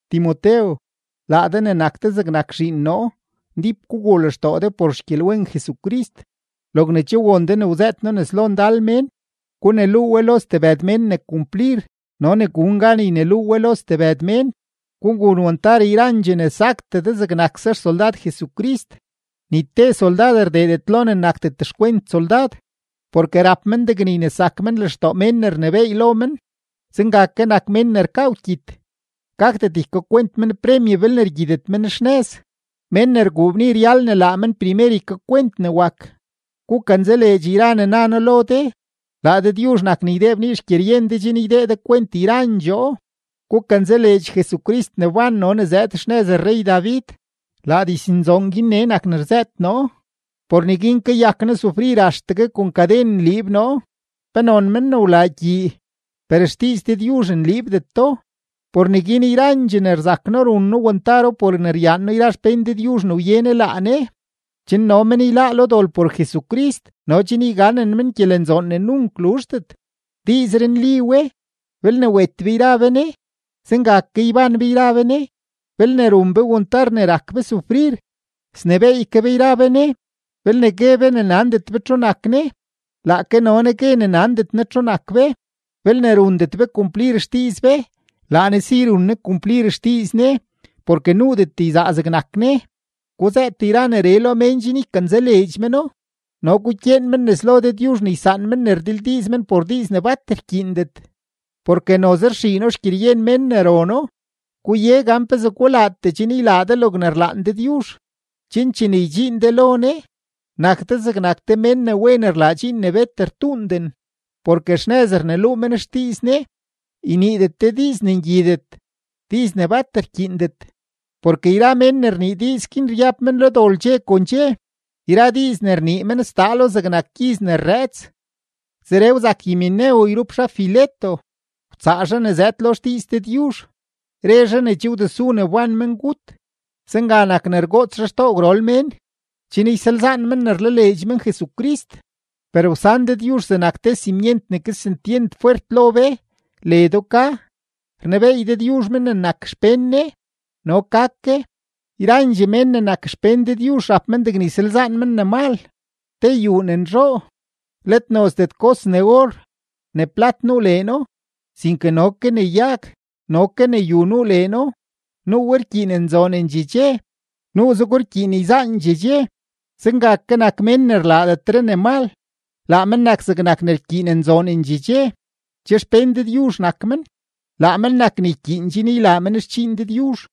Timotew, laa de ne nak de zegnak zhiin noo, ndíp guguu lextoo de por xgyelwen Jesucrist. Logne che won de ne wzëët noo nes lo ndal mén, guneluu we lo stebëd mén ne kumplir no ne gun gan yneluu we lo stebëd mén. Gugun wantar yrandxee ne saktee de zegnakse xsoldad Jesucrist. Ni te soldad rdeedet lo ne nakdet xkwent soldad, porke rap men degne ynesak men lextoo mén ne rnebééy lo men. Zenga ke nak mén ne rkaa wkyit, gakdet ykakwent men premye belne rgyitet men xnëz. Mén ne rguu bni ryal ne laa men primer ykakwent ne wak. Gukanzaleedx yra ne na noo lo de; laa Dëdyuzh nak ne ydee bnii xgyeryen de chen ydee de kwent yrandxoo. Gukanzaleedx Jesucrist ne wban no ne zëëd xnëz rrey-David. Laa diznzoon guin nee nak ne rzëët noo; por neguin kayak noo sufrir axtegue kon kaden nliib noo, penon men ne wlaa gyii; per xdiiz Dëdyuzh nliibdeto. Por neguin yrandxee ne rzak noo run noo wantaro por ne ryaan noo yra xpén Dëdyuzh ne wye Ne laa Ne, chen no men yláá lo dol por Jesucrist no chen yganen men gyelenzoon ne nunk luzhdet. Diizree nli we: Belne wet be yra be Ne, zenga ke ybán be yra be Ne; belne run be wantar ne rak be sufrir, snebééy ke be yra be Ne; belne gue be ne nandet be txu nak Ne, laake no Ne gue ne nandet Ne txu nak be; belne rundet be kumplir xdiiz be, laa Ne si run Ne kumplir xdiiz Ne porke nuudet yzaa zegnak Ne. Guzëët yra neree lo mén chen ykanzaleedx meno, no gukyeen men nes lo Dëdyuzh ne ysaan men ne rdildiiz men por diiz ne bat rkyiindet, porke noze rxiino xgyeryen mén ne rono. Guye gan pezee gulaatee chen ylaa de logne rlaan Dëdyuzh, chen chene ydxiin de lo Ne, nak de zegnak te mén ne wen rlaa dxiin ne bet rtuunden, porke xnëz rneluu men xdiiz Ne. Yniidet de diiz ne ngyidet, diiz ne bat rkyiindet, porke yra men ne rnii diiz guin ryab men lo dol dxe kon dxe. Yra diiz ne rnii men sdaalo zegnak gyiz ne rrëëts. Zeree wzak Himeneo yrup zhaa Fileto, wtsaa zhaa ne zëëd lo xdiiz Dëdyuzh; re zhaa ne che wdesu ne wban mengut. Zenga nak ne rgoots zhaa xtoo gwrol mén, chen ysalzaan men ne rlaleedx men Jesucrist. Per wsan Dëdyuzh zegnak te simyent ne kesentyent fwert lo be, ledo ka: “Rnebeey Dëdyuzh men ne nak xpén Ne”, no ka ke: “Yrandxee mén ne nak xpén Dëdyuzh rap men degne ysalzaan men ne mal.” Te yuu ne nzhoo, let nozdet kos ne or, ne plat nuu leeno, sinke no ke ne yag no ke ne yu nuu leeno; nuu we rkyiin nzoonendxee dxe, nuuzego rkyiin yzaandxee dxe. Zenga ke nak mén ne rlaadetre ne mal; laa men nak zegnak ne rkyiin nzoonendxee dxe; che xpén Dëdyuzh nak men, laa men nak ne ykyiin chen ylaa men xdxiin Dëdyuzh,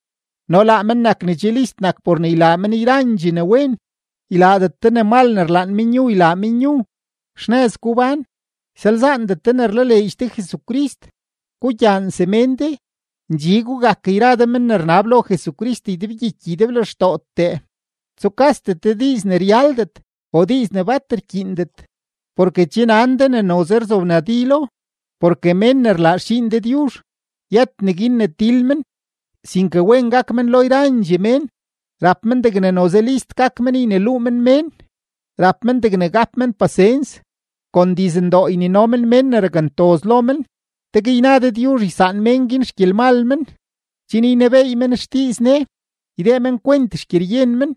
no laa men nak ne che list nak por ne ylaa men yrandxee ne wen. Ylaadet de ne mal ne rlaan menyu ylaa menyu, xnëz gubán, ysalzaandet de ne rlaleedx de Jesucrist, gugyaan semén de, ndxi gugak yra de men ne rnab lo Jesucrist ydebgyiky ydeblextootee. Tsukasdet de diiz ne ryaldet o diiz ne bat rkyiindet, porke che nan de ne noze rzobnadilo. Porke mén ne rlaa xdxiin Dëdyuzh, yët neguin ne til men, sinke wen gak men lo yrandxee mén, rap men degne noze list gak men yneluu men mén, rap men degne gap men pasens, kon dizndoo ynino men mén ne rakntoz lo men; tegue yna Dëdyuzh ysaan mén guin xgyelmal men, chen ynebeey men xdiiz Ne, ydee men kwent xgyeryen men,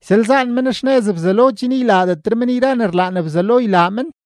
ysalzaan men xnëz Bzelo chen ylaadetre men yra ne rlaan Bzelo ylaa men.